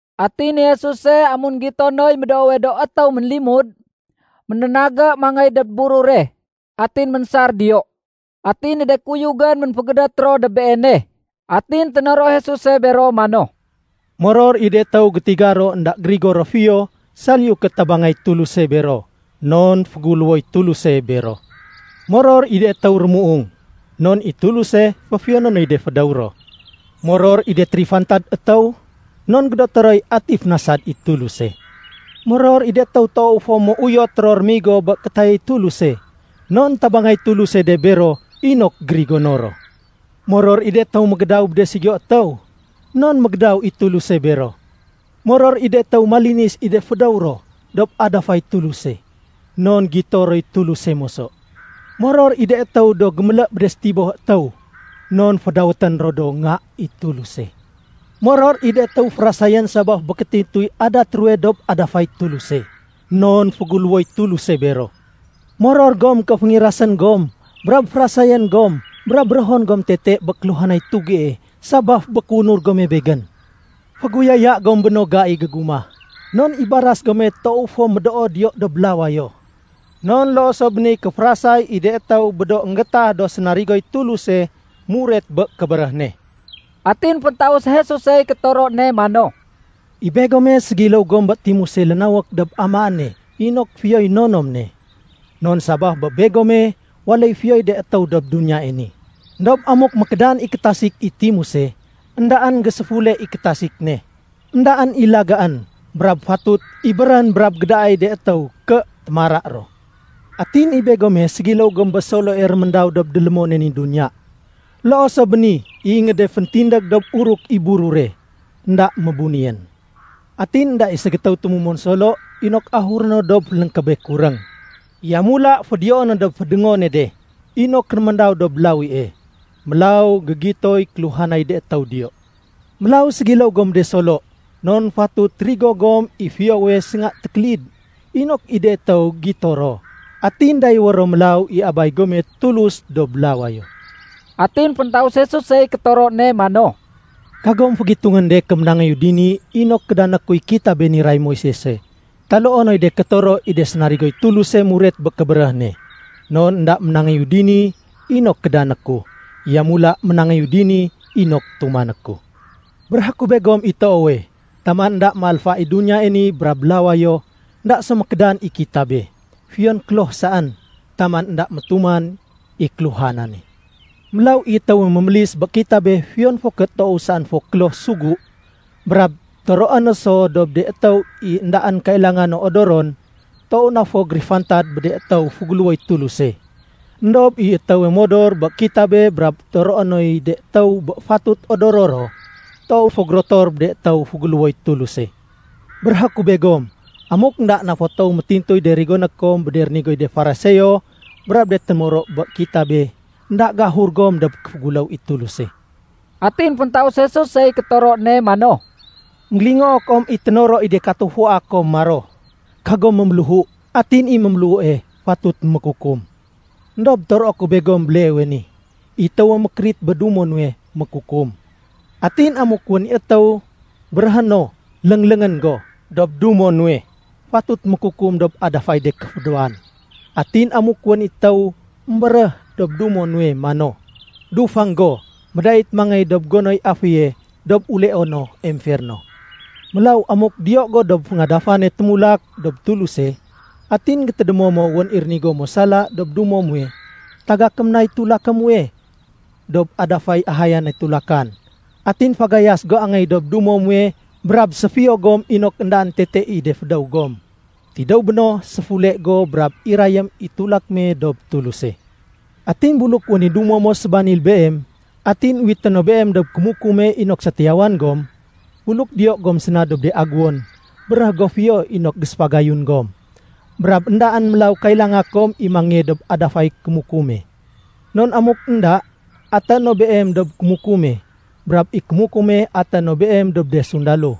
Atin i Jesuse amun énggito noy médoowe do étéw ménlimud, ménénagé mangéy dob burure, atin ménsar diyo. Atin i de kuyugén ménfégédét ro dob Beene. Atin ténoro Jesuse bero mano, “Moror i de étéw gétiga ro énda gérigo ro fiyo saliyu ké tabangay Tuluse bero, non féguléwoy Tuluse bero. Moror i de étéw rémuung, non i Tuluse féfiyoné noy de fédéw ro. Moror i de térifantad étéw non gédoté roy ati fénasad i Tuluse. Moror i de étéw toow fo méuyot ro rémigo bé kétayay Tuluse, non tabangay Tuluse de bero inok gérigono ro. Moror i de étéw mégédaw bé de ségiyo étéw, non mégédaw i Tuluse bero. Moror i de étéw malinis i de fédéw ro dob adafay Tuluse, non gito roy Tuluse moso. Moror i de étéw do gémélé bé de sétiboh étéw, non fédawétén ro do nga i Tuluse. Moror i de étéw férasayén sabaf bé kétintuy adat ruwe dob adafay Tuluse, non féguléwoy Tuluse bero. “Moror gom ké féngirasén gom brab férasayén gom brab béréhon gom tete bé kéluhanay tugie sabaf bé kéunur gome Begén. Féguyaya gom bé no gai gégumah, non i baras gome toow fo médoo diyo dob lawayo. Non loo so bé niy kéférasay i de étéw bé do énggétah do sénarigoy Tuluse muret bé kébéréh ne.” Atin féntaus Jesusey kétoro ne mano, “I begome ségiléw gom bé timuse lénawék dob amaéne inok fiyoy nonom ne. Non sabaf bé begome, waléy fiyoy de étéw dob duniyae ni. Endob amuk mékédan i kétasik i timuse, éndaén géséfule i kétasik ne. Endaén i lagaén, brab fatut ibérén brab gédaay de étéw ké témara ro. “Atin i begome ségiléw gom bé soloe réméndaw dob délémone ni duniya. Loo so bé ni, i ingéde féntindég dob uruk i burure, énda mébunéyén. Atin énda i ségétéw tumumon solo inok ahuré no dob fénléngkébé kuréng. Yamula fédiyoé no dob fédongone de inok réméndaw dob lawie. Mélaw gégitoy kéluhanay de étéw diyo. Mélaw ségiléw gom bé de solo, non fatut rigo gom i fiyowe sénga tékélid, inok i de étéw gito ro, atin dayéwé ro mélaw i Abay gome Tuluse dob lawayo.” Atin féntaus Jesusey kétoro ne mano, “Kagom fégitungén de ké ménangéyu dini inok kédané kuy kitabé niray Moisese taloo noy de kétoro i de sénarigoy Tuluse muret bé kébéréh ne. Non énda ménangéyu dini inok kédané ku, yamula ménangéyu dini inok tumané ku. Béréhé ku begom i toowe, taman énda méalfa i duniyae ni brab lawayo, énda so mékédan i kitabe, fiyon kloh saén, taman énda métuman i kéluhanane. Mélaw i étéwe mémélis bé kitabé fiyon fo ké toow saén fo kloh sugu, brab toroé no so dob de étéw i éndaén kailanga no odoron, toow na fo gérifantad bé de étéw féguléwoy Tuluse. Endob i étéwe modor bé kitabé brab toroé noy de étéw bé fatut odoro ro, toow fo gérotor bé de étéw féguléwoy Tuluse. Béréhé ku begom, amuk énda toow na fo métintuy de rigoné kom bé de rigonéy de Fariseo brab de témoro bé kitabe, énda géahur gom dob kéféguléw i Tuluse.” Atin féntaus Jesusey kétoro ne mano, “Enggélingoo kom i ténoro i de katufua kom maro, ‘Kagom méméléhu, atin i méméléhue fatut mékukum.’ Endob toroé ku begom béleewe ni: I étéwe mékérit bé dumo nuwe, mékukum. Atin amuk wén i étéw béréhé no, ‘Léngléngén go’ dob dumo nuwe, fatut mékukum dob adafay de kéfédéwan. Atin amuk wén i étéw émbéréh dob dumo nuwe mano, ‘Dufang go’, médait mangéy dob gonoy aféye dob uleono emferno. Mélaw amuk diyo go dob féngadafane témulak dob Tuluse, atin gétédémo mo wén i rénigo mo sala dob dumo muwe, tagakém nay tulaké muwe dob adafay ahayane tulakan, atin fagayas go angéy dob dumo muwe brab séfiyo gom inok éndaén tete i de fédéw gom. Tidéw béno, séfule go brab irayém i tulak me dob Tuluse. “Atin buluk wén i dumo mo sébanil beem, atin uwité no beem dob kémukume inok sétiyawan gom, buluk diyo gom séna dob de aguwon, béréh go fiyo inok géséfagayun gom, brab éndaén mélaw kailanga kom i, mangéye dob adafay kémukume. Non amuk Enda, atéé no beem dob kémukume, brab i kémukume atéé no beem dob de sundalo,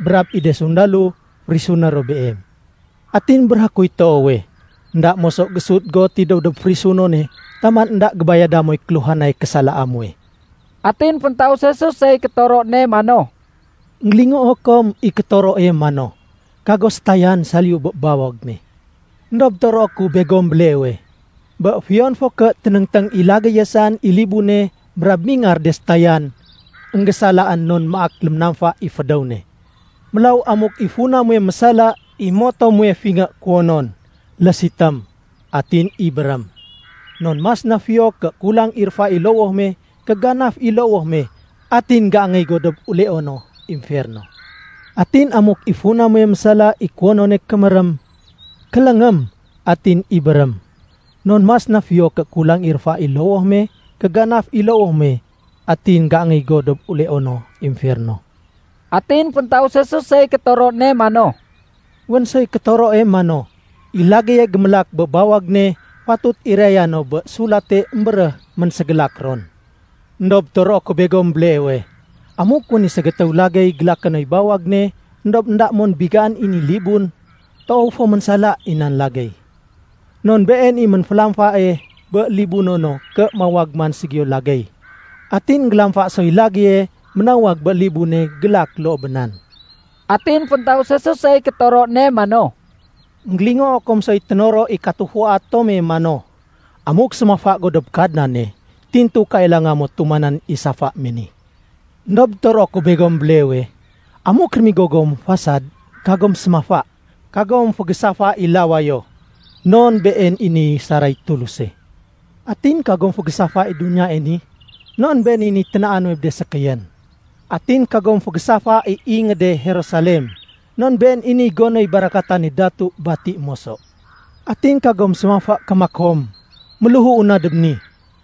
brab i de sundalo férisuné ro beem. Atin béréhé kuy toowe, énda moso géésut go tidéw dob férisunone taman énda gébayada moy kéluhanay késalaa muwe.” Atin féntaus Jesusey kétoro ne mano, “Enggélingoo kom i kétoroe mano, ‘Kago sétayan saliyu bé bawag me.’ Endob toroé ku begom béleewe, bé fiyon fo ké ténéngténg i lagéye saén i libune brab mingar de sétayan, énggésalaén non maak léménamfa i fédéw ne. Mélaw amuk i funa muwe mésala i moto muwe fingé kuwonon, lésitém atin ibérém. Non mas na fiyo ké kulang i réfa i lowoh me ké ganaf i lowoh me atin géangéy go dob uleono emferno. Atin amuk i funa muwe mésala i kuwonone kémérém, kéléngém, atin ibérém. Non mas na fiyo ké kulang i réfa i lowoh me ké ganaf i lowoh me atin géangéy go dob uleono emferno.” Atin féntaus Jesusey kétoro ne mano, “Wén soy kétoroe mano, ‘I lagéye gémélak bé bawag ne fatut iraya no bé sulate émbéréh ménségélak ron.’ Endob toroé ku begom béleewe, amuk wén i ségétéw lagéy gélaké noy bawag ne éndob énda mon bigaén i ni libun, toow fo ménsala i nan lagéy. Non been i ménfélamfae bé libuno no ké mawag man ségiyo lagéy. Atin énggélamfa soy lagéye ménawag bé libune gélak loo bé nan.” Atin féntaus Jesusey kétoro ne mano, “Enggélingoo kom soy ténoro i katufua tome mano, ‘Amuk sémafa go dob Kadnane, tintu kailanga mo tumanén i safa me ni.’ Endob toroé ku begom béleewe, amuk rémigo gom fasad, kagom sémafa. Kagom fégésafa i lawayo non been i niy saray Tuluse. Atin kagom fégésafa i duniyae ni non been i niy ténaa nuwe bé de sékéyén. Atin kagom fégésafa i ingéde Jerusalem non been i niy gonoy barakatane Datu bati moso. Atin kagom sémafa ké makom, ‘Méléhuu na dob ni.’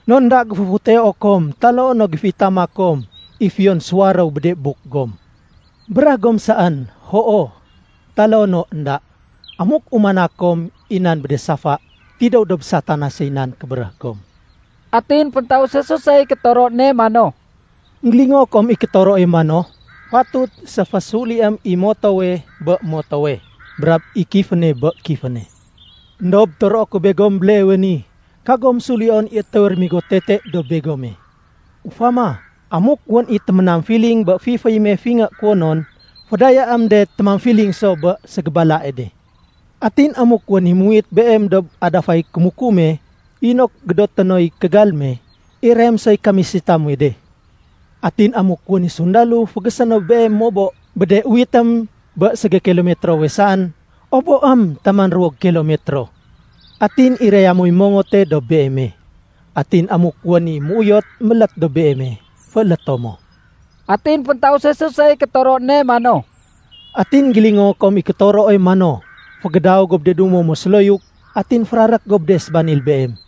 Non énda géféfuteo kom taloo no géféitama kom i fiyon suwaréw bé de buk gom. Béréh gom saén, ‘Hoo’, taloo no ‘Enda.’ Amuk umana kom i nan bé de safa, tidéw dob Satanasey nan kébéréh gom.” Atin féntaus Jesusey kétoro ne mano, “Enggélingoo kom i kétoroe mano, ‘Fatut séfésuliém i motowe bé motowe, brab i kiféne bé kiféne.’ Endob toroé ku begom béleewe ni, kagom sulion i étéwe réménigo tete dob begome. Ufama, amuk wén i téménamfiling bé fiféy me fingé kuwonon, fédayaém de témamfiling so bé ségébalae de. Atin amuk wén i muwit beem dob adafay kémukume inok gédoté noy kégal me irayém soy kamisita muwe de. Atin amuk wén i sundalo fégésé no beem mobo bé de uwitén bé ségékilomitrowe saén, oboém taman ruwo gékilomitro. Atin iraya moy mongote dob beeme. Atin amuk wén i méuyot mélét dob beeme, fééléto mo.” Atin féntaus Jesusey kétoro ne mano, “Atin énggélingoo kom i kétoroe mano, ‘Fégédaw go bé de dumo mo séloyuk, atin férarék go bé de sébanil beem.’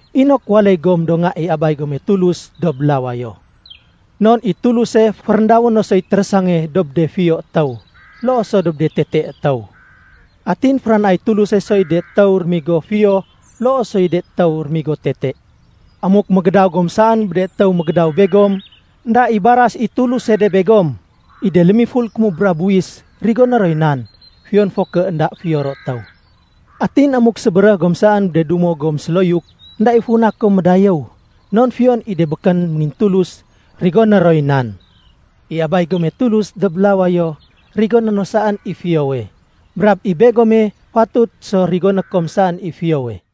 inok waléy gom do nga i Abay gome Tulus dob lawayo. Non i Tuluse féréndawé no soy térésange dob de fiyo étéw loo so dob de tete étéw. Atin féranaay Tuluse soy de étéw rémigo fiyo loo soy de étéw rémigo tete. Amuk mégédaw gom saén bé de étéw mégédaw begom, énda i baras i Tuluse de begom. I de lémiful kémubra buwis rigoné roy nan, fiyon fo ké énda fiyo ro étéw. Atin amuk sébéréh gom saén bé de dumo gom séloyuk, énda i funa kom médayéw. Non fiyon i de békén méngintulus rigoné roy nan. I Abay gome Tulus dob lawayo, rigoné no saén i fiyowe. Brab i begome fatut so rigoné kom saén i fiyowe.”